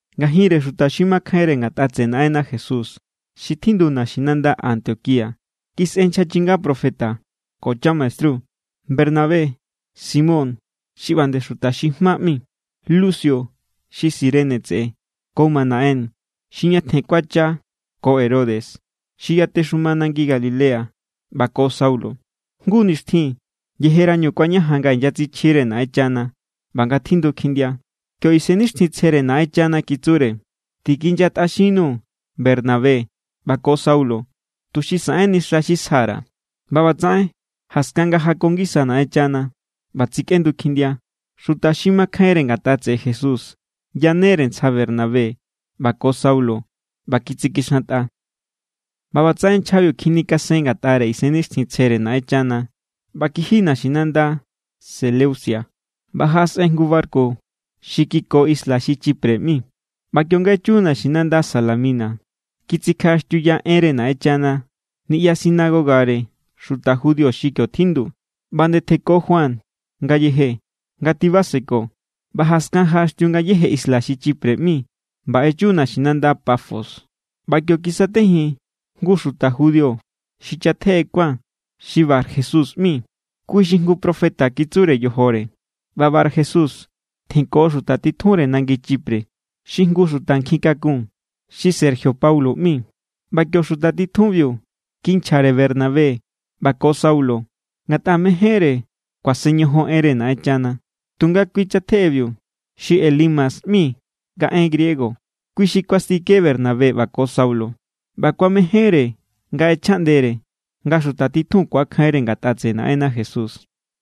Ngajinre xuta xi makjainre ngatꞌa tseꞌe Naꞌenna Jesús xi tjindu naxinanda Antioquía kisꞌe nchja chinga profeta ko chamaestru: Bernabé, Simón xi ꞌba nde Xuta xi Jma ꞌmi, Lucio xi Cirene tseꞌe, ko Manaén xi ñatjen kuacha ko Herodes xi yatexuma nangi Galilea, ꞌba ko Saulo. Jngu nixtjin, yejerañu kuañajan nga inyatsichjire Naꞌenchana ꞌba nga tjindu kjindia, kio Isennixtjintsjere Naꞌenchana kitsure: —Tikinyatꞌaxinnu Bernabé ꞌba ko Saulo tuxi saꞌenni xa xi sja_ra̱. ꞌBa ꞌbatsaꞌen, jaskan nga jako ngisa Naꞌenchana ꞌba tsikꞌendu kjindia, xuta xi makjainre ngatꞌa tseꞌe Jesús yanere ntsja Bernabé ꞌba ko Saulo ꞌba kitsikixantꞌa. ꞌBa ꞌbatsaꞌen nchjabiu kjinikasen ngatꞌare Isennixtjintsjere Naꞌenchana ꞌba kiji naxinanda Seleucia. ꞌBa jaꞌasꞌen jngu barku xi kiko isla xi Chipre ꞌmi. ꞌBa kionga echu naxinanda Salamina, kitsikjaꞌaxtiuya enre Naꞌenchana niꞌya sinagogare xuta judío xi kio tjindu. ꞌBa nde tjenko Juan ngayeje nga tibaseko. ꞌBa jaskan jaꞌaxtiu ngayéje isla xi Chipre ꞌmi ꞌba echu naxinanda Pafos. ꞌBa kio kisatejin jngu xuta judío xi chatjeꞌe kuán xi Barjesús ꞌmi. Kui xi jngu profeta kitsure yojore. ꞌBa Barjesús tjenko xuta titjunre nangi Chipre, xi jngu xuta nkjikakun xi Sergio Paulo ꞌmi. ꞌBa kio xuta titjunbiu kinchjare Bernabé ꞌba ko Saulo, ngatꞌa mejénre kuasen ñojon enre Naꞌenchana. Tunga kui chatjeꞌebiu, xi Elimas ꞌmi nga en griego, kui xi kuastike Bernabé ꞌba ko Saulo. ꞌBa kuamejénre nga ꞌechjaꞌndere nga xuta titjun ku̱akjainre ngatꞌa tseꞌe Naꞌenna Jesús.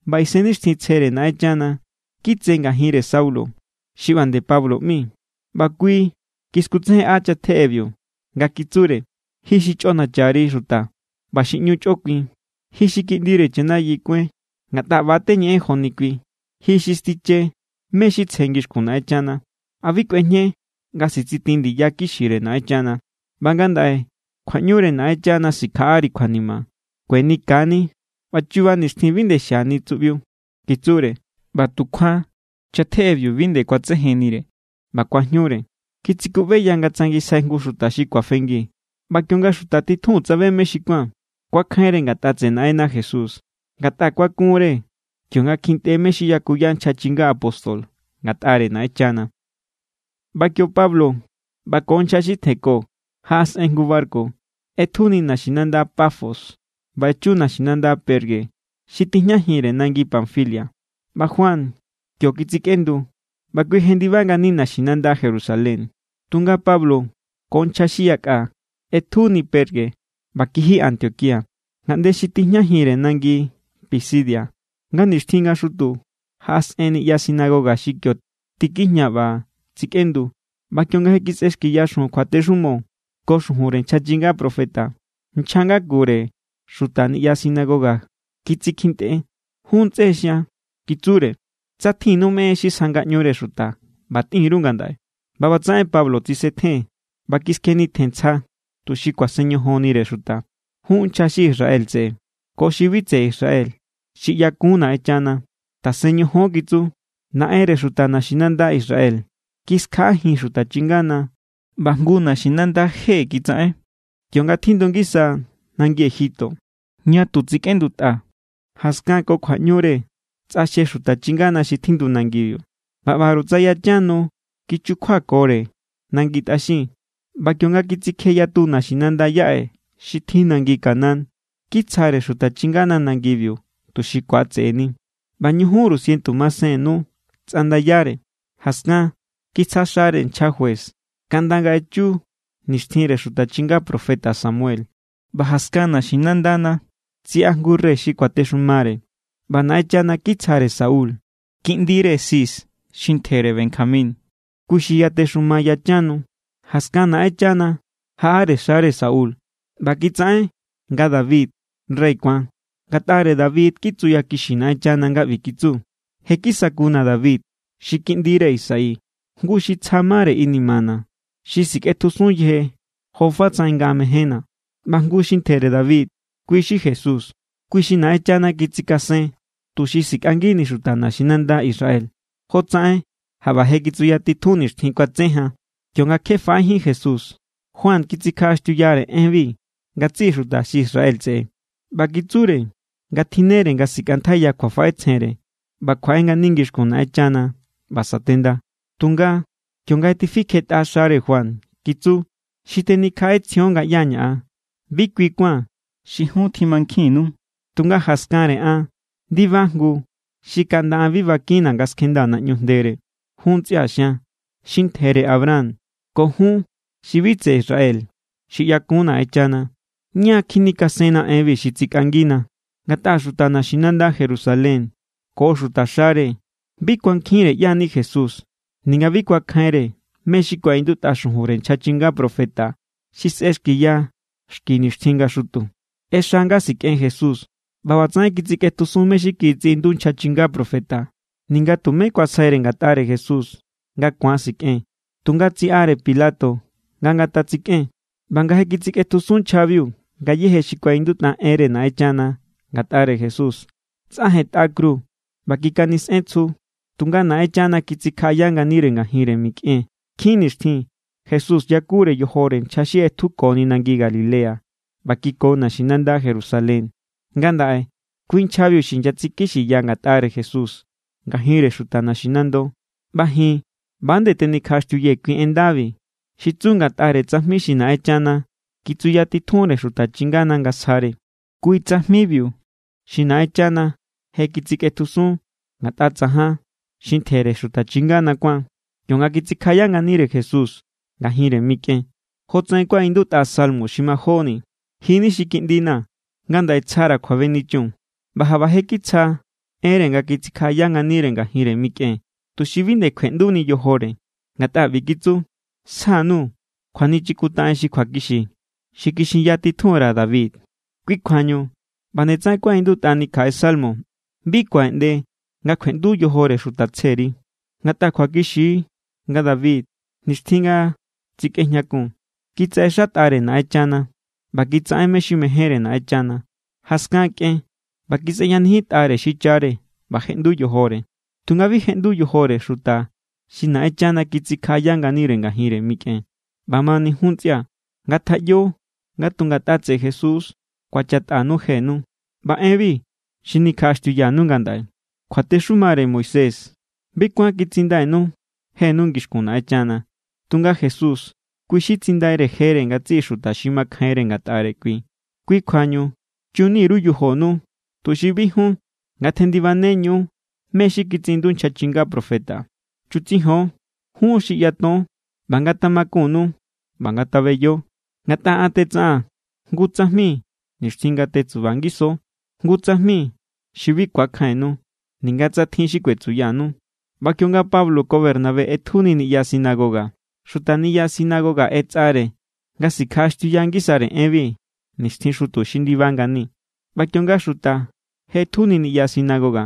ꞌBa Isennixtjintsjere Naꞌenchana kitse ngajinre Saulo xi ꞌba nde Pablo ꞌmi, ꞌba kui kiskutsejenꞌa chatjeꞌebiu nga kitsure: —¡Ji xi chꞌonacha_ri xuta ꞌba xi ꞌñu chꞌokuin! ¡Ji xi kiꞌndire chanayi kuáin ngatꞌa ꞌba teñeꞌen joni kui! ¡Ji xi stiche mé= xi tsje ngixkun Naꞌenchana! ¿A bi kꞌuejñe nga sitsitin ndiya kixire Naꞌenchana? ꞌBa ngandaꞌe kjuaꞌñure Naꞌenchana sikjaꞌari kjuanima. Kueni ka= ni ꞌba chuba nixtjin bi nde xiani tsuꞌbiu —kitsure. ꞌBa tukjuan chatjeꞌebiu bi nde kuatsejennire ꞌba kuajñure. Kitsikuꞌbeya nga tsangisjai jngu xuta xi kuafengi. ꞌBa kionga xuta titjun tsabe mé xi kuán, kuakjainre ngatꞌa tseꞌe Naꞌenna Jesús, ngatꞌa kuakunre kionga kjintꞌe mé= xi yakuya nchja chinga apóstol ngatꞌare Naꞌenchana. ꞌBa kio Pablo ꞌba ko nchja xi tjenko jaꞌasꞌen jngu barku. ꞌEtjuni naxinanda Pafos ꞌba echu naxinanda Perge xi tijñajinre nangi Panfilia. ꞌBa Juan kio kitsikꞌendu ꞌba kui jendiba ngani naxinanda Jerusalén. Tunga Pablo ko nchja xi yakꞌa ꞌetjuni Perge ꞌba kiji Antioquía, ngaꞌnde xi tijñajinre nangi Pisidia. Nga nixtjin nga xutu jaꞌasꞌen niꞌya sinagoga xi kio tikijña ꞌba tsikꞌendu. ꞌBa kionga je kisꞌexkiya xujun kjuatexumo ko xujunre nchja chinga profeta, nchja ngakure xuta niꞌya sinagoga kitsikjintꞌe: —Jun ntsꞌe xian —kitsure—, tsa tjinnu mé= en xi sja ngaꞌñure xuta, ꞌba tꞌin_ru ngandaꞌe. ꞌBa ꞌbatsaꞌen Pablo tsisetjen ꞌba kiskjenitjen ntsja tuxi kuasen ñojonnire xuta. —Jun nchja xi Israel tseꞌe ko xi bi tseꞌe Israel xi ꞌyakun Naꞌenchana, tasen ñojon —kitsu—. Naꞌenre xuta naxinanda Israel kiskjaꞌajin xuta chingana ꞌba jngu naxinanda je kitsaꞌen, kionga tjindu ngisa nangi Egipto, ña tu tsikꞌendutꞌa. Jaskan ko kjuaꞌñure tsꞌaxje xuta chingana xi tjindu nangibiu ꞌba ꞌbaru tsa yachan nu kichukjuakore nangi tꞌaxin. ꞌBa kionga kitsikje yatu naxinanda yaꞌe xi tjin nangi Canaán, kitsjare xuta chingana nangibiu tuxi ku̱atse̱ꞌe̱ni. ꞌBa ñujunru sientu masen nu tsꞌandayare. ’Jaskan kitsja xare nchja juez kaꞌnda nga echu nixtjinre xuta chinga profeta Samuel. ꞌBa jaskan naxinandana tsiꞌa jngu rey xi kuatexumare, ꞌba Naꞌenchana kitsjare Saúl, kiꞌndire Cis xi ntjere Benjamín. Kui xi yatexuma yachan nu. Jaskan Naꞌenchana jaꞌare xare Saúl ꞌba kitsaꞌen nga David rey kuán. Ngatꞌare David= kitsuyakixi Naꞌenchana nga ꞌbi kitsu: “Je= kisakuna̱ David xi kiꞌndire Isaí. Jngu xuta xi tsja mare inimana̱, xi sikꞌetjusun yeje jofatsaꞌen nga mejénna̱.” ꞌBa jngu xi ntjere David, kui xi Jesús, kui xi Naꞌenchana kitsikasen tuxi sikꞌangini xuta naxinanda Israel, jotsaꞌen jaꞌba je kitsuyatitjun nixtjin kuatse jan. ’Kionga kje faꞌejín Jesús, Juan kitsikjaꞌaxtiuyare enbi ngatsiꞌi xuta xi Israel tseꞌe ꞌba kitsure nga tjinnere nga sikꞌantjaiya kjuafaꞌetsjenre ꞌba kjuaꞌe ngani ngixkun Naꞌenchana ꞌba satenda. Tunga, kionga je tifikjetꞌa xare Juan, kitsu: “Xi tenikjaꞌetsjion nga ꞌyá= ña̱, bi kui kuán xi jun tjimankjinnu. Tunga jaskanre an ndiba jngu xi kaꞌnda an bi bakinna̱ nga skjendaa̱ naꞌñu jndere.” ’Jún ntsꞌia̱ xian, xi ntjere Abraham ko jun xi bi tseꞌe Israel xi ꞌyakun Naꞌenchana, ña= kjinikasenna enbi xi tsikꞌangina. Ngatꞌa xuta naxinanda Jerusalén ko xutaxare bi kuankjinre ꞌyá= ni Jesús ninga bi kuankjinre mé= xi kuaꞌindutꞌa xujunre nchja chinga profeta xi sꞌexkiya xki nixtjin nga xutu. ꞌExa nga sikꞌen Jesús ꞌba ꞌbatsaꞌen kitsikꞌetjusun mé= xi kitsiꞌindu nchja chinga profeta. Ninga tumé kuasjaire ngatꞌare Jesús nga ku̱an sikꞌen, tunga tsiꞌare Pilato nga ngatatsikꞌen. ’ꞌBa nga je kitsikꞌetjusun nchjabiu ngayéje xi kuaꞌindutꞌa enre Naꞌenchana ngatꞌare Jesús, tsꞌajentꞌa kru ꞌba kikanisꞌen tsju. Tunga Naꞌenchana kitsikjaꞌaya nganire ngajinre mikꞌen. Nkjin nixtjin Jesús yakure yojore nchja xi ꞌetjukoni nangi Galilea ꞌba kiko naxinanda Jerusalén. Ngandaꞌe kui nchjabiu xi inyatsikixiya ngatꞌare Jesús ngajinre xuta naxinando. ’ꞌBa ji̱n ꞌba=nde tenikjaꞌaxtiuyee̱ kui en ndabi, xi tsu ngatꞌare tsajmi xi Naꞌenchana kitsuyatitjunre xuta chingana nga sjare. Kui tsajmibiu xi Naꞌenchana je kitsikꞌetjusun ngatꞌa tsajan xi ntjere xuta chingana kuán, kionga kitsikjaꞌaya nganire Jesús ngajinre mikꞌen. Jotsaꞌen kuaꞌindutꞌa salmo xi majóni: “Ji= ni xi Kiꞌndina̱. Ngandaꞌe tsjara̱ kjuabenichun.” ꞌBa jaꞌba je kitsja enre nga kitsikjaꞌaya nganire ngajinre mikꞌen tuxi bi nde kjueꞌnduni yojore, ngatꞌa ꞌbi kitsu: “Sja_nuu̱ kjuanichikintaꞌen xi kjuakixi, xi kixinya titjun_ra̱ David.” ’Kui kjuañu ꞌba nde tsaꞌen kuaꞌindutꞌani kjaꞌe salmo: “Bi kuaꞌeꞌnde nga kjueꞌndu yojore Xuta tsjeri.” Ngatꞌa kjuakixi= nga David, nixtjin nga tsikꞌejñakun, kitsaꞌexátꞌare Naꞌenchana. ꞌBa kitsaꞌen mé= xi mejénre Naꞌenchana. Jaskan kꞌen ꞌba kisꞌeyanijintꞌare xichare ꞌba jeꞌndu yojore. Tunga bi jeꞌndu yojore xuta xi Naꞌenchana kitsikjaꞌaya nganire ngajinre mikꞌen. ’ꞌBamani, jun ntsꞌia̱ ngatjaꞌyo nga tu ngatꞌa tseꞌe Jesús= ku̱achatꞌanu jenu. ꞌBa enbi xi nikjaꞌaxtiuyanu ngandaꞌe. Kjuatexumare Moisés bi kuán kitsindainu jenu ngixkun Naꞌenchana. Tunga Jesús kui xi tsindaire jere ngatsiꞌi xuta xi makjainre ngatꞌare kui. Kui kjuañu chunni_ru yojonu tuxi bi jun ngatjendibaneñu mé= xi kitsiꞌindu nchja chinga profeta: Chutsijon, jun xi ꞌyaton, ꞌba ngatamakunnu ꞌba ngatabeyo. Ngatꞌa an tetsaꞌaa̱n jngu tsajmi nixtjin nga tetsuba ngiso, jngu tsajmi xi bi ku̱akjainnu, ninga tsa tjin xi kuetsuyanu. ꞌBa kionga Pablo ko Bernabé ꞌetjuni niꞌya sinagoga, xuta sinagoga ꞌetsꞌare nga sikjaꞌaxtiuya ngisare enbi nixtjin xutu xi ndiba ngani. ꞌBa kionga xuta je ꞌetjuni niꞌya sinagoga,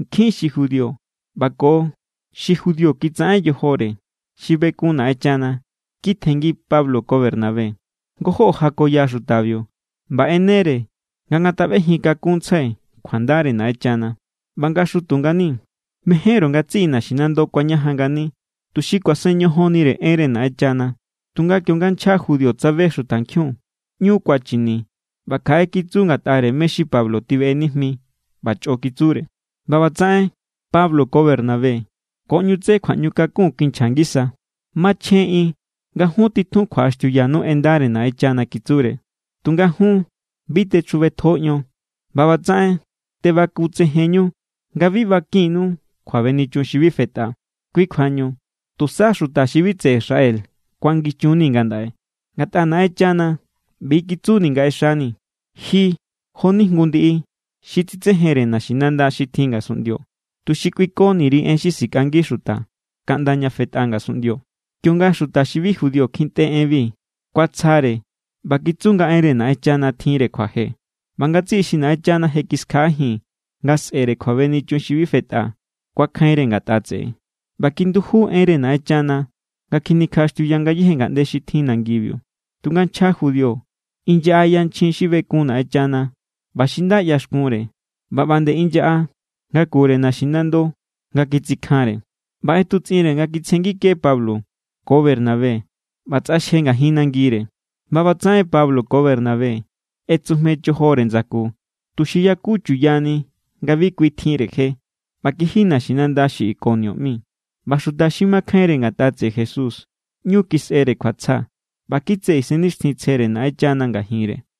nkjin xi judío ꞌba ko xi judío kitsaꞌen yojore xi bekun Naꞌenchana kitjenngi Pablo ko Bernabé. Ngojó jakoya xutabiu ꞌba ꞌenere nga ngataꞌbejin kakunntsjai kjuandare Naꞌenchana. ꞌBa nga xutu ngani, mejenru ngatsiꞌi naxinando kuañajan ngani, tuxi kuasen ñojonnire enre Naꞌenchana. Tunga kionga nchja judío tsabe xutankjiun, ꞌñu kuachini ꞌba kjaꞌe kitsu ngatꞌare mé= xi Pablo tibeꞌe nijmi ꞌba chꞌo kitsure. ꞌBa ꞌbatsaꞌen Pablo ko Bernabé ko ꞌñu tse kjuaꞌñukakun kinchja ngisa: —Machjen=ꞌin nga jun titjun kjuaꞌaxtiuyanu enre Naꞌenchana —kitsure—. Tunga jun bi techjubetjo ion ꞌba ꞌbatsaꞌen tebakutsejenñu nga bi bakinnu kjuabenichun xi bi fetꞌa. Kui kjuañu tusa xuta xi bi tseꞌe Israel kuangichunnii̱ ngandaꞌe. Ngatꞌa Naꞌenchana ꞌbi= kitsuni nga ꞌexani̱: Ji jo=ni jngu ndiꞌi xi tsitsejenre naxinanda xi tjin ngasunꞌndio, tuxi kꞌuikoni_ri en xi sikꞌangi xuta kaꞌnda ña fetꞌa ngasunꞌndio. Kionga xuta xi bi judío kjintꞌe enbi, kuatsjare ꞌba kitsu nga enre Naꞌenchana tjinre kjuaje. ꞌBa ngatsiꞌi xi Naꞌenchana je kiskjaꞌajin nga sꞌe̱re kjuabenichun xi bi fetꞌa kuakjainre ngatꞌa tseꞌe. ꞌBa kinduju enre Naꞌenchana nga kjinikjaꞌaxtiuya ngayéje ngaꞌnde xi tjin nangibiu. Tunga nchja judío inyaꞌa yanchjin xi bekun Naꞌenchana ꞌba xi nda ꞌyaxkunre, ꞌba nde inyaꞌa ngakure naxinando nga kitsikjanre. ꞌBa ꞌetutsꞌinre nga kitsjengike Pablo ko Bernabé ꞌba tsꞌaxje ngajin nangire. ꞌBa ꞌbatsaꞌen Pablo ko Bernabé ꞌetsujme chojore ndsaku tuxi yaku chuyani nga bi kui tjinre je, ꞌba kiji naxinanda xi Ikonio ꞌmi. ꞌBa xuta xi makjainre ngatꞌa tseꞌe Jesús, ꞌñu kisꞌere kjuatsja ꞌba kitse Isennixtjintsjere Naꞌenchana ngajinre.